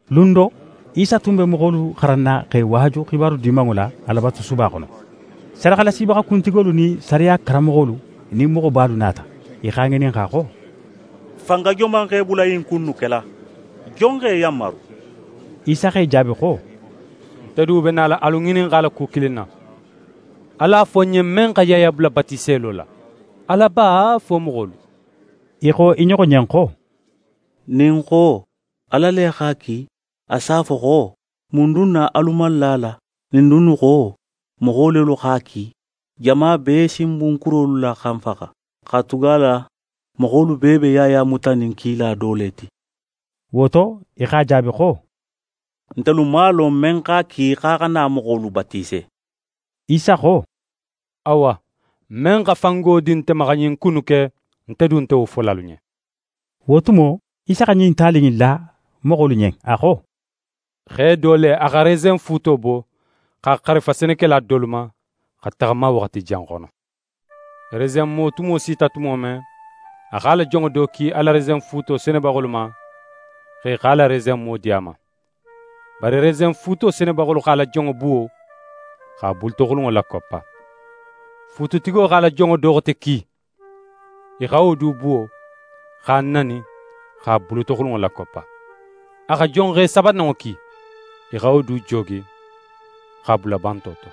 Lun do, Isa tun be moxolu xaranna x'e waaju xibaru Dimanŋo la Alabatusuba xono. Sadaxalasibaxa kuntigolu nin sariya karanmoxolu nin moxobalu nata. I x'a ŋininxa xo: «Fanga joman x'é bula ɲin ku innu kela? Jon x'é yanmaru?» Isa x'e jaabi xo: «Nte du be nala alu ŋininxala ku kilin na. Alu a fo ń ɲen, men xa Yaya bula batiselo la, Ala ba, fo moxolu?» I xo i ɲoxo ɲen xo: «Nin n xo: “Ala le x'a ki”, a s'a fo xo: “Mun dun na alu man la a la?” Nin n dunnu xo: “Moxo lelu x'a ki”, jama bee si n bun kurolu la xa n faxa, katugala moxolu bee be Yaya mutanin kila do le ti.» Wo to, i x'a jaabi xo: «Ntelu man a lon, men x'a ki x'a xa na moxolu batise.» Isa xo: «Awa, men xa fango di nte ma xa ɲin ku innu ke, nte du nte wo fola alu ɲen.» Wo tumo, Isa xa ɲin tali in la moxolu ɲen, a xo: «Xe do le, a xa resenfuuto bo, x'a xarifa senekela dolu ma, xa taxama waxati jan xono. Resenmo tumo sita tumo men, a x'a la jonŋo do ki a la resenfuuto senebaxolu ma, xo i x'a la resenmo di a ma. Bari resenfuuto senebaxolu x'a la jonŋo buwo, x'a bulutoxulunŋo lakoppa. Fuututigo x'a la jonŋo do xote ki. I xa wo du buwo, x'a nani, x'a bulutoxulunŋo lakoppa. A xa jonxe sabananŋo ki. I xa wo du joogi, x'a bula banto to.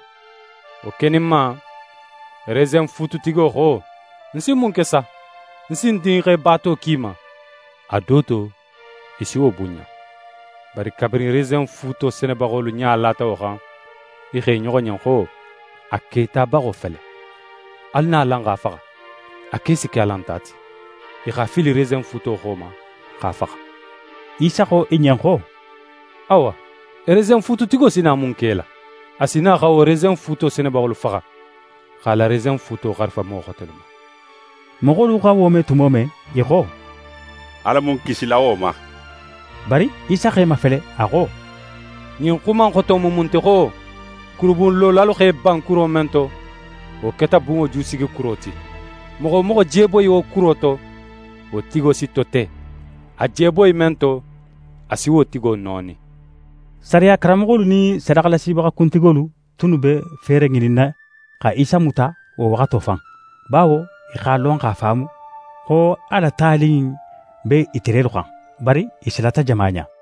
Wo keninma, resenfuututigo xo: “Ń si mun ke sa? Ń si ń dinxe baato ki i ma; a do to i si wo bunɲa.” Bari kabirin resenfuuto senebaxolu ɲa lata wo xan, i xo i ɲoxo ɲen xo: “A ketabaxo fele. Alu na, alan x'a faxa. A ke si ke alan ta ti.” I x'a fili resenfuuto xo ma, x'a faxa.» Isa xo i ɲen xo: «Awa, resenfuututigo si na mun ke i la? A si na xa wo resenfuuto senebaxolu faxa, x'a la resenfuuto xarifa moxo xotelu ma.» Moxolu xa wo me tumo men, i xo: «Ala mu n kisila wo ma!» Bari Isa x'e mafele, a xo: «Ɲin xuma in xoto mu mun ti xo: “Kurubunlolalu x'e ban kuro men to, wo keta bunŋo jusigikuro ti”? Moxo wo moxo je boyi wo kuro to, wo tigo si tote. A je boyi men to, a si wo tigo nooni.» Sariya karanmoxolu nin sadaxalasibaxa kuntigolu tunnu be feere ŋininna xa Isa muta wo waxato fan, bawo i x'a lon x'a faamu, xo a la tali in be ite lelu xan. Bari i silata jama ɲa.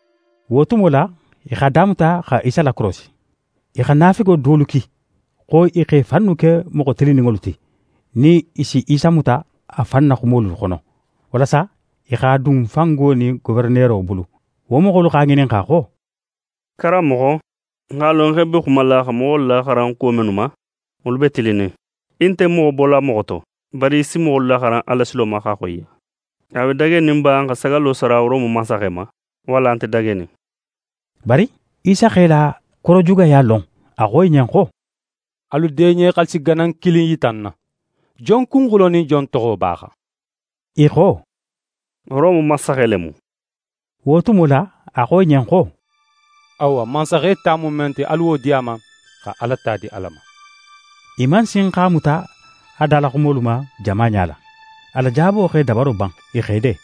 Wo tumo la, i x'a damuta xa Isa lakorosi. I xa naafigo dolu ki, xo i x'e fannu ke moxo tilinninŋolu ti, nin i si Isa muta a fan na xumolu xono, walasa i x'a dun fango nin goferenero bulu. Wo moxolu x'a ŋininxa xo: «Karanmoxo, n x'a lon xo í be xumala xa moxolu laxaran kuwo mennu ma, wolu be tilinnin. Í nte moxo bola moxo to, bari í si moxolu laxaran Alasilo ma x'a xoyiya. A be dagenin ba n xa sagallo sara Rome mansaxe ma, walla a nte dagenin?» Bari Isa x'e la korojugaya lon. A xo i ɲen xo: «Alu deɲe xaalisi ganan kilin yita ń na. Jon kunxulo nin jon toxo be a xan?» I xo: «Rome mansaxe le mu.» Wo tumo la, a xo i ɲen xo: «Awa, mansaxe ta mu men ti, alu wo di a ma, xa Ala ta di Ala ma.» I man sin x'a muta a dalaxumolu ma jama ɲala. A la jaabo x'e dabaro ban. I x'e de.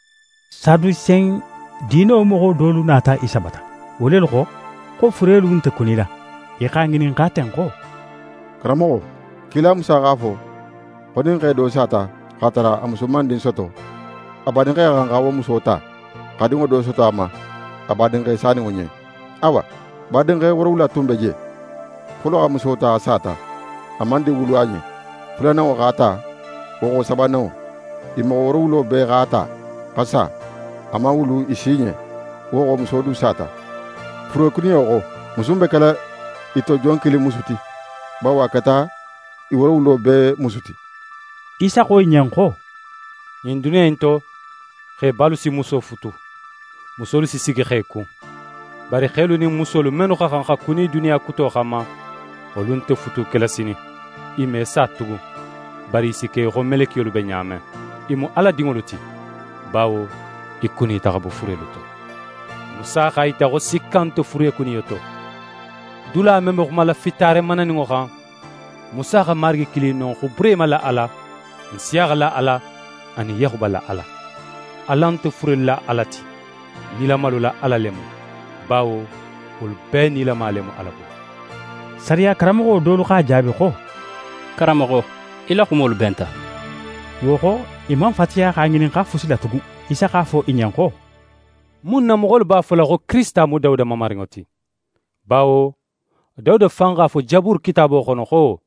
Sadusen diino moxo dolu nata Isa bata. Wo lelu xo, xo furelu nte kunila. I x'a ŋininxa ten xo: «Karanmoxo, kila Musa x'a fo xo nin xe do sata, x'a tara a musu man din soto, a badinxe xa xan xa wo muso ta, xa dinŋo do soto a ma, a badinxe saninŋo ɲen. Awa, badinxe woorowula tun be je. Folo xa muso ta, a sata, a man din wulu a ɲen. Fulananŋo x'a ta, wo xo sabananŋo. I moxo woorowulo bee x'a ta, xa sa, a man wulu i si ɲen. Wo xo, muso du sata. Furekuniyo xo, musu in be kela i to jon kilin musu ti? Bawo a keta i woorowulo bee musu ti.» Isa xo i ɲen xo: «Ɲin duniya in to, xebalu si muso futu, musolu si sigi xe kun. Bari xelu nin musolu mennu xa xan xa kuni duniya kuto xanma, wolu nte futu kela sinin. I me sa tugun, bari i si ke í xo melekiyolu be ɲa men. I mu Ala dinŋolu ti, bawo i kunita xa bo furelu to. Musa x'a yita xo sikka nte furekuniyo to. Dula men be xumala fitaare mananinŋo xan, Musa xa Marigi kili non xo Burehima la Ala, Nsiyaxa la Ala, anin Yaxuba la Ala. Ala nte furelu la Ala ti, nilamalu la Ala le mu, bawo wolu bee nilama le mu Ala bulu.» Sariya karanmoxo dolu x'a jaabi xo: «Karanmoxo, í la xumolu benta!» Wo xo, i man fatiya x'a ŋininxa fusi la tugun. Isa x'a fo i ɲen xo: «Mun na moxolu b'a fola xo Kirisita mu Dawuda Mamarinŋo ti? Bawo Dawuda fan x'a fo Jaburu kitaabo xono xo: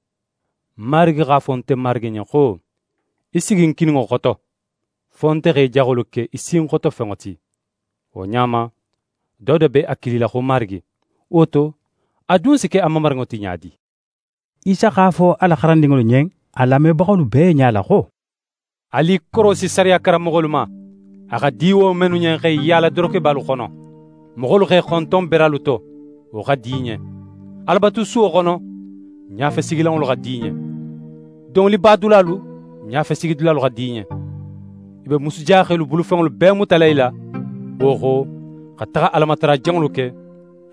“Marigi x'a fo nte Marigi ɲen xo: Í sigi ń kininŋo xoto, fo nte xa í jaxolu ke í sinxotofenŋo ti.” Wo ɲa ma, Dawuda be a kilila xo Marigi: Wo to, a dun si ke a mamarinŋo ti ɲa di?» Isa x'a fo a la xarandinŋolu ɲen a lamebaxolu bee ɲala xo: «Alu i korosi sariya karanmoxolu ma, a xa di wo mennu ɲen x'e yaala dorokebalu xono. Moxolu x'e xonton beralu to, wo xa di i ɲen. Alabatusuwo xono, ɲafesigilanŋolu xa di i ɲen. Domolibadulalu, ɲafesigidulalu xa di i ɲen. I be musujaxelu bulufenŋolu bee mutala i la, wo xo, xa taxa Alamatara janŋolu ke,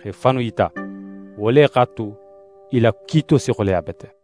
x'e fannu yita. Wo le x'a tu, i la kiito si xoleya bete.»